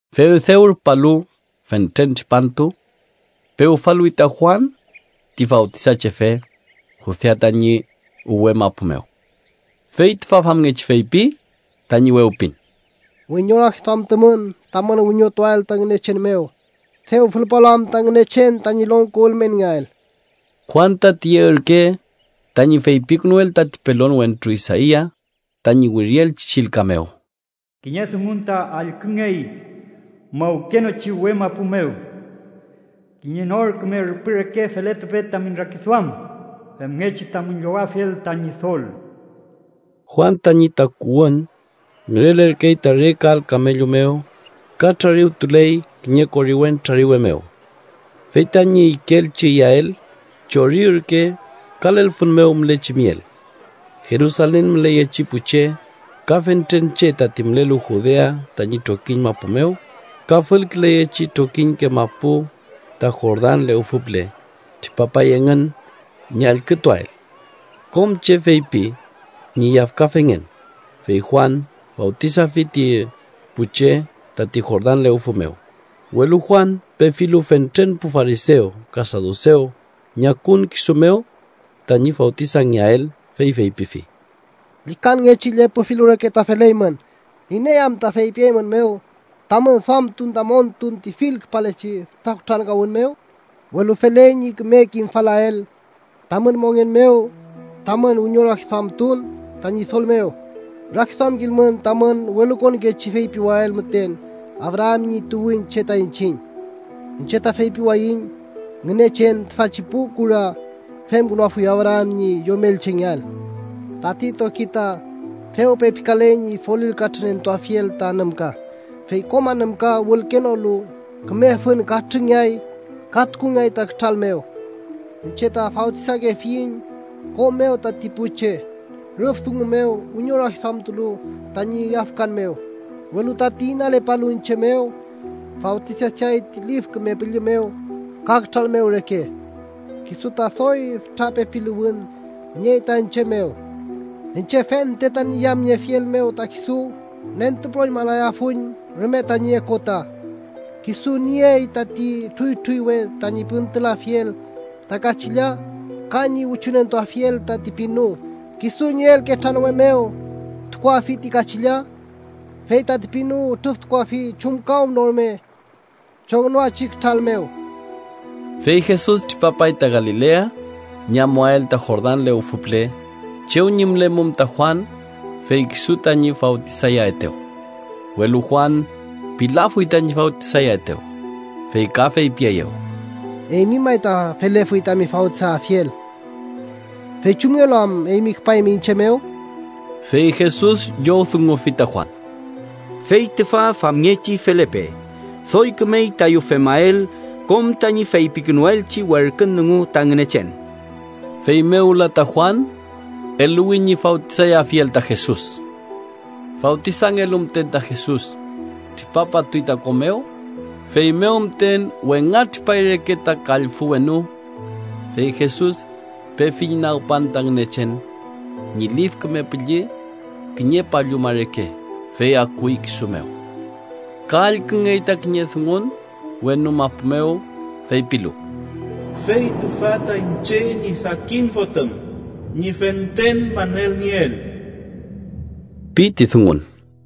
Fey dew rupalu fentren tripantu pewfaluwi ta Juan ti Fawtisachefe Judea tañi uwe mapu mew. Fey ta famngechi feypi tañi wewpin: “¡Wiñorakiduamtumün tamün wiñotuael ta Ngünechen mew, dew fülpalu am ta Ngünechen tañi longko ülmenngeael!” Juan ta tiye ürke tañi feypikünuel tati pelon wentru Isaia tañi wirielchi chillka mew: “Kiñe dungun ta allküngey mawkenochi uwe mapu mew: ‘Kiñe nor küme rüpü reke feletupe tamün rakiduam, femngechi tamün llowafiel ta Ñidol.’” Juan tañi takuwün ngürelerkey ta re kal kamellu mew, ka trariwtuley kiñe koriwen trariwe mew. Fey tañi ikeelchi iyael chori ürke ka lelfün mew mülechi miel. Jerusalen müleyechi pu che ka fentren che tati mülelu Judea tañi trokiñ mapu mew ka fülküleyechi trokiñke mapu ta Jordan lewfü püle, tripapay engün ñi allkütuael. Kom che feypi ñi yafkafengen, fey Juan fawtisafi ti pu che tati Jordan lewfü mew. Welu Juan pefilu fentren pu farisew ka sadusew ñi akun kisu mew tañi fawtisangeael, fey feypifi: “¡Llükanngechi llepü filu reke ta feleymün! ¿Iney anta feypieymünmew tamün duamtun ta montun ti fülkülepachi fütra kutrankawün mew? Welu feley ñi küme kimfalael tamün mongen mew tamün wiñorakiduamtun ta Ñidol mew. Rakiduamkilmün tamün welukonkechi feypiael müten: ‘Abraam ñi tuwünche ta iñchiñ’. Iñche ta feypiwayiñ: Ngünechen tüfachi pu kura femkünuafuy Abraam ñi yomelchengeael. Tati toki ta dew pepikaley ñi folil katrünentuafiel ta anümka. Fey kom anümka wülkenolu küme fün katrüngeay ka tukungeay ta kütral mew. Iñche ta fawtisakefiñ ko mew tati pu che rüf dungu mew wiñorakiduamtulu tañi yafkan mew, welu tati inalepalu iñche mew, fawtisacheay ti Lif Küme Püllü mew ka kütral mew reke. Kisu ta doy fütra pepiluwün niey ta iñche mew. Iñche fente tañi yamniefiel mew ta kisu nentupüroñmalayafuiñ rume tañi okota. Kisu nüniey tati trüytrüywe tañi püntülafiel ta kachilla ka ñi wichunentuafiel tati pinu. Kisu ñi elketranwe mew tukuafi ti kachilla, fey tati pinu ütrüftukuafi chumkawnorume chongnoachi kütral mew.” Fey Jesus tripapay ta Galilea ñi amuael ta Jordan lewfü püle, chew ñi mülemum ta Juan, fey kisu tañi fawtisayaetew. Welu Juan pilafuy tañi fawtisayaetew, fey ka feypieyew: —Eymi may ta felefuy tami fawtisayafiel, fey ¿chumngelu am eymi küpaymi iñche mew? Fey Jesus llowdungufi ta Juan: —Fey tüfa famngechi felepe. Doy kümey tayu femael kom tañi feypikünuelchi werkün dungu ta Ngünechen. Feymew wüla ta Juan eluwi ñi fawtisayafiel ta Jesus. Fawtisangelu müten ta Jesus, tripapatuy ta ko mew. Feymew müten wengatripay reke ta kallfü wenu, fey Jesus pefi ñi nagpan ta Ngünechen ñi Lif Küme Püllü kiñe palluma reke, fey akuy kisu mew. Ka allküngey ta kiñe dungun wenu mapu mew, feypilu: “Fey tüfa ta iñche ñi sakin Fotüm, ñi fentren manelnieel” pi ti dungun.